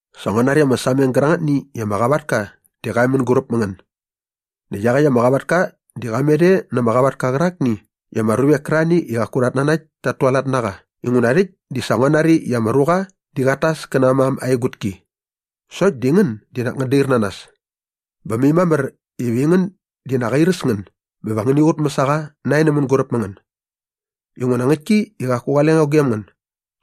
Sa ngua nari ama sameng gärangätni i ama qavatka di qa e mänguräp mä ngän. Näkt iaqäkt ama qavatka di qa met e na ama qavatka qärakni i ama ruvek kärarhani i qaku rhat nanakt tat tualat na qa inguna rhäkt di sa ngua nari i ama ruqa di qat tas kä na aa mam aa egutki. Sokt di ngän di nak ngän dair na nas. Bä mai mamär iva aingän di nak airäs ngän bä va ngäni qutmäs a qa nae nä mänguräp mä ngän. Inguna ngäktki i qaku qale ngo gem ngän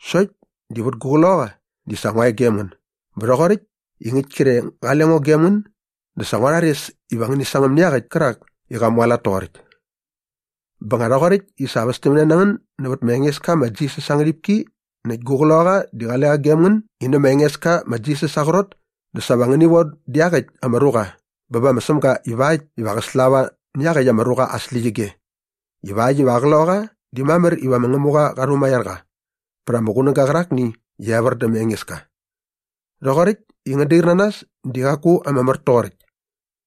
sokt di vät ama qloqaqa di sa ngua e gem ngän bä rhoqoräkt i ngäkt kre qale ngo gem ngän dä sa ngua rhares iva ngäni sangäm nä iaqäkt kärak i qa mualat toqoräkt. Bä nga rhoqoräkt i sa västämne na ngän nävät ma Engeska ma Jisas aa ngärhipki näkt gu qloqaqa di qale qa gem ngän i nä ma Engeska ma Jisas aa qrot dä sa va ngäni von dä iaqäkt ama ruqa bä bä ma Sämga ivakt iva qä slava nä iaqäkt ama ruqa aa släqyige ivakt iva aa qloqaqa di mamär iva ma Ngämuqa qa rhumaiar qa vät ama qunäga qärakni iva evär dä ma Engeska. Rhoqoräkt i ngän dair na nas di qaku ama mär toqoräkt.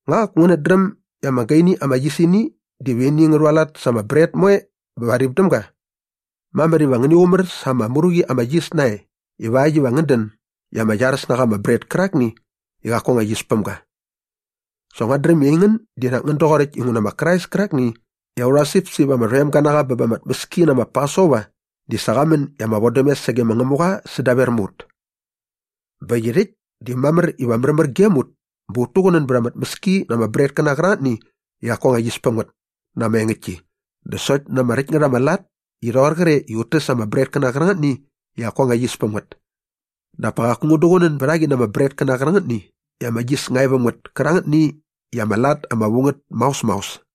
Nga qaku ngänät dräm i ama gaini ama yisini diva ini ngä rhualat sa ama bret moe bä va rip däm ga? Mamär iva ngäni qumär sa ama mru qi ama yis nae ivakt iva ngän dän i ama iaräs na qa ama bret kärakni i qaku anga yis päm ga. Sa nguat dräm i aingän di nak ngän doqoräkt inguna ma Krais kärakni i aurha sipsip ama rhoem ga na qa bä ba ama tmäski ma Pasova di sa qa män i ama vodämes sage ma Ngämuqa sädaver mä ut. Bä äkt i rhäkt di mamär iva märmär gem ut bä ut tuqunän bät ama tmäski na ama bretkäna qärangätni i qaku anga yis päm ngät na ama engäktki dä sokt na ama räkt ngät ama lat i rhoqor qre i ut täs ama bretkäna qärangätni i qaku anga yis päm ngät. Dap pa qaku ngän duqunän bät a qi na ama bretkäna qärangätni i ama yis nga e väm ngät kärangätni i ama lat ama vu ngät maos maos.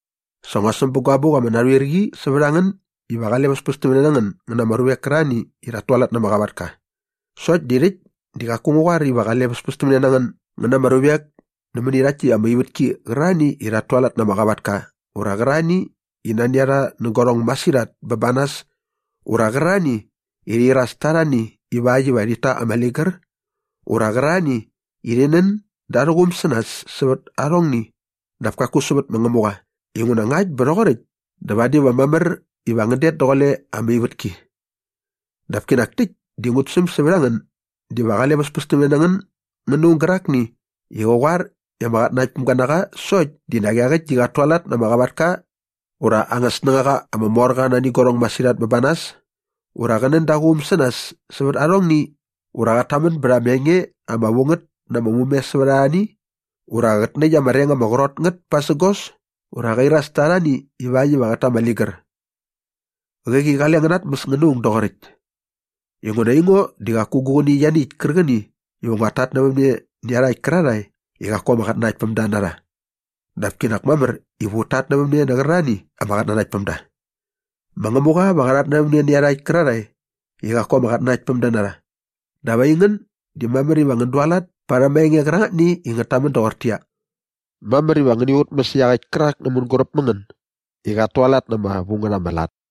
Sa ngua säm bä gua abuk ama narhuir qi sävät a ngän iva qale väspästämne na ngän ngän na ama ruvek kärarhani i rhat tualat na ama qavatka. Sokt di rhäkt di qaku ngu qoar iva qale väspästämne na ngän ngän na ama ruvek nämäni rhakt täkt ama ivätki qärarhani i rhat tualat na ama qavatka ura qärarhani i nani a rha nä guarhong masirhat bä ba nas ura qärarhani i rhi iras ta arhani ivakt iva rhit ta ama ligär ura qärarhani i rhi nän da arhä quum sä nas sävät arhongni dap kaku sävät ma Ngämuqa inguna ngakt bä rhoqoräkt dä vadi va mamär iva ngän det daqule ama ivätki. Dap kinak täkt di ngut säm sävät a ngän diva qale väspästämne na ngän ngän na aung gärakni i qä qoar i ama qatnanaktpämga na qa sokt di nak iaqäkt di qat tualat na ama qavatka ura aa anga snängaqa ama mor qa nani guarhong masirhat ba nas ura qä nän da aa quum sä nas sävät arhongni ura qat tamän bät ama enge ama vu ngät na ama mume sävät arhani ura qät näkt ama reng ama qrot ngät pasägos ura qä iras ta arhani ivakt iva qät ta ama ligär. Qäqi qale ngän natmäs ngän na aung doqoräkt. Inguna aingo di qaku gu qäni ianiäkt kärqäni iva nguat tatnävämne nä iarhakt kärarhae i qaku ama qatnanaktpämda na rha. Dap kinak mamär iva ut tatnävämne nä qärarhani ama qatnanaktpämda. Ma Ngämuqa va qa rhatnävämne nä iarhakt kärarhae i qaku ama qatnanaktpämda na rha. Dap aingän di mamär iva ngän dualat parhäm aa enge qärangätni i ngät tamän doqortäqyia, “Mamär iva ngäni qutmäs iaqäkt kärak nä mänguräp mä ngän i qat tualat na ama vu ngät ama lat.”